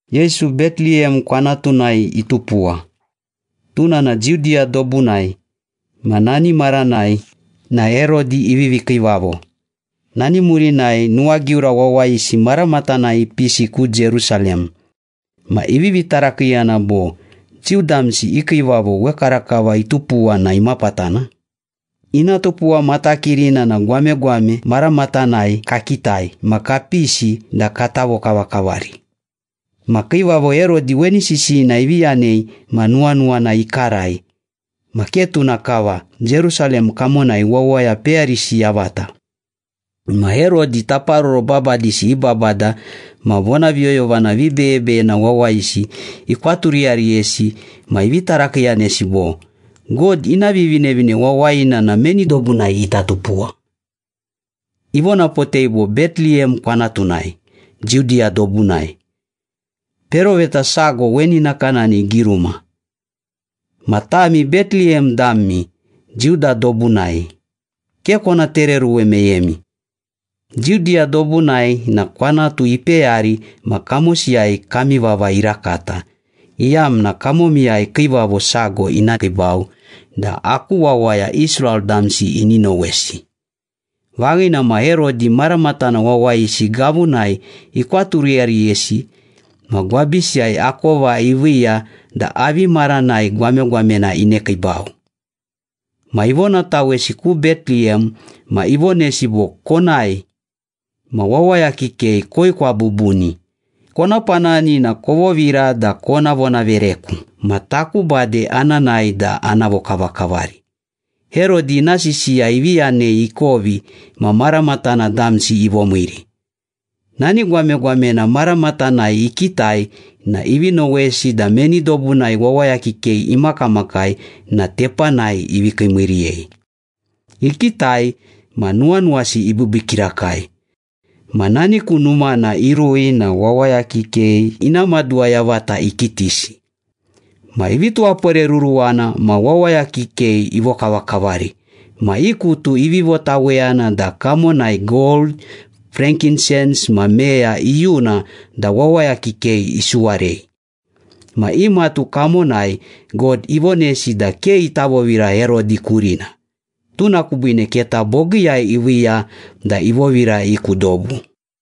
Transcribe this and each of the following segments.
Yesu Beteliyem kwanatunai itupuwa, tuna na Judiya dobunai ma nani maranai na Herodi ivivi kiivavo. Nani murinai nuwagiura wawayisi maramatanai ipisi ku Jerusalem ma ivivi tarakiiyana bo, “Jiu damsi i kiivavo wekarakava itupuwa na imapatana? Ina tupuwa matakirina na gwamegwame maramatanai kakitai ma kapisi da kata vokavakavari.” Ma Kiivavo Herodi weni sisiyina ivi yanei ma nuwanuwana ikarai, ma ke tuna kava, Jerusalem kamonai wawaya peyarisi yavata. Ma Herodi taparoro babadisi i babada ma vonaviyoyovana vibeyebeyena wawayisi ikwaturiyariyesi ma ivi tarakiiyanesi bo, “God ina Vivinevine Wawayina na meni dobunai ita tupuwa?” Ivonapotei bo, “Beteliyem kwanatunai, Judiya dobunai. Peroveta sago weni nakanani igiruma, ‘Ma tami Beteliyem dami, Juda dobunai, Ke kona tereoruwe meyemi. Judiya dobunai na kwanatu ipeyari ma kamosiyai kami vava irakata, iyamna kamomiyai kiivavo sago ina kiibau da aku wawaya Israel damsi ini nowesi.’” Vaghina ma Herodi maramatana wawayisi gavunai ikwaturiyariyesi ma gwabisiyai akova iviiya da avi maranai gwamegwamena inekiibau. Ma ivonatawesi ku Beteliyem ma ivonesi bo, “Konae, ma wawaya kikei koekwa bubuni. Kona panani na kovovira da kona vonavereku. Ma taku bade ana nae da ana vokavakavari.” Herodi ina sisiya ivi yanei ikovi ma maramatana damsi ivomiiri. Nani gwamegwamena maramatanai ikitai na ivi nowesi da meni dobunai wawaya kikei imakamakai na tepanai ivi kiimiiriyei. Ikitai ma nuwanuwasi ibiibii kirakai. Ma nani ku numana irui na wawaya kikei ina maduwa yavata ikitisi. Ma ivi tuwaporeruruwana, ma wawaya kikei ivokavakavari. Ma i kutu ivi votaweyana da kamonai gold, frankinsens ma meya iyuna da wawaya kikei isuwarei. Ma i matu kamonai God ivonesi da ke ita vovira Herodi kurina, tuna kubiine keta bogiiyai iviiya da ivovira i ku dobu.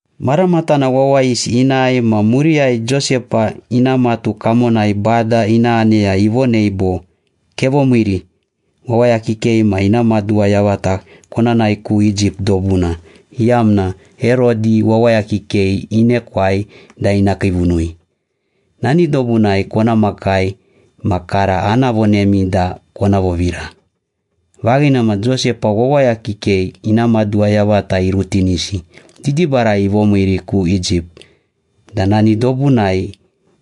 Maramatana wawayisi inae ma muriyai Josepa ina matu kamonai Bada ina aneya ivonei bo, “Kevomiiri, wawaya kikei ma ina maduwa yavata kona nae ku Egypt dobuna, iyamna Herodi wawaya kikei inekwai da ina kiivunui. Nani dobunai kona makai ma kara ana vonemi da kona vovira.” Vaghina ma, Josepa wawaya kikei ina maduwa yavata irutinisi, didibarai ivomiiri ku Egypt da nani dobunai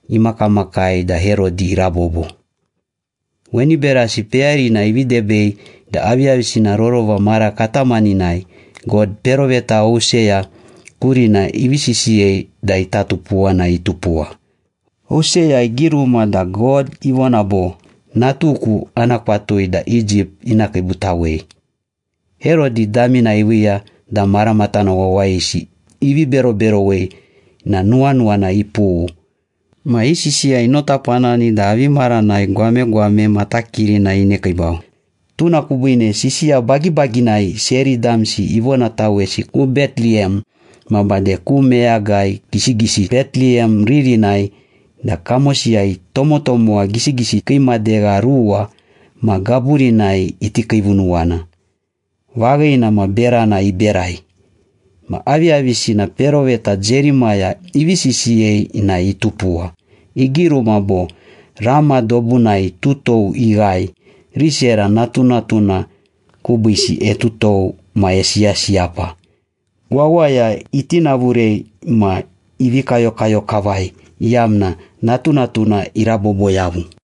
imakamakai da Herodi irabobo. Weni berasi peyarina ivi debei da aviyavisina rorova mara katamaninai God peroveta Hoseya kurina ivi sisiyei da ita tupuwa na itupuwa. Hoseya igiruma da God ivona bo, “Natuku ana kwatui da Egypt ina kiibutawei.” Herodi damina iviiya da maramatana wawayisi ivi beroberowei na nuwanuwana ipughu. Ma i sisiya inotapanani da avi maranai gwamegwame matakirina inekiibau. Tuna kubiine sisiya bagibaginai seri damsi ivonatawesi ku Beteliyem ma bade ku meyagai gisigisi Beteliyem ririnai da kamosiyai tomotomowa gisigisi kii madegha ruwa ma gaburinai iti kiivunuwana. Vaghina ma berana iberai. Ma aviyavisina peroveta Jerimaya ivi sisiyei na itupuwa. Igiruma bo, “Rama dobunai tutou ighae. Risera natunatuna kubiisi etutou ma esiyasiyapa. Wawaya itinavurei ma ivi kayokayo kavai, iyamna natunatuna irabobo yavu.”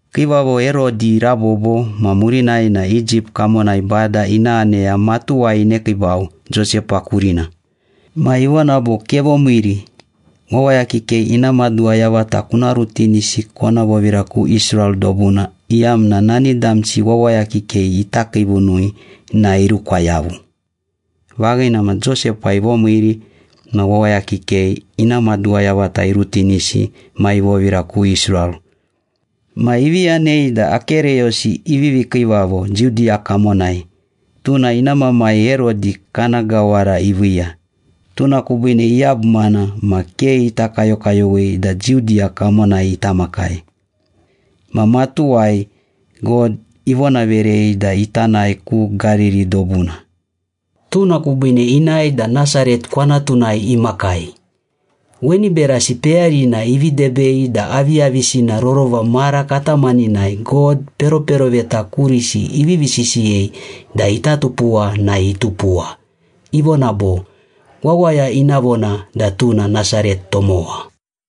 Kiivavo Herodi irabobo ma murinai na Egypt kamonai Bada ina aneya matuwai inekiibau Josepa kurina. Ma ivona bo, “Kevomiiri, wawaya kikei ina maduwa yavata kuna rutinisi kona vovira ku Israel dobuna, iyamna nani damsi wawaya kikei ita kiivunui na irukwa yavu.” Vaghina ma Josepa ivomiiri ma wawaya kikei ina maduwa yavata irutinisi ma ivovira ku Israel. Ma ivi yanei da Akereyosi ivivi kiivavo Judiya kamonai, tuna ina mamai Herodi kana gawara iviiya. Tuna kubiine iyabumana ma ke ita kayokayowei da Judiya kamonai ita makai. Ma matuwai God ivonaverei da ita nae ku Gariri dobuna. Tuna kubiine inae da Nasaret kwanatunai imakai. Weni berasi peyarina ivi debei da aviyavisina rorova mara katamaninai God peroperoveta kurisi ivivi sisiyei da ita tupuwa na itupuwa, ivona bo, “Wawaya ina vona da tuna Nasaret tomowa.”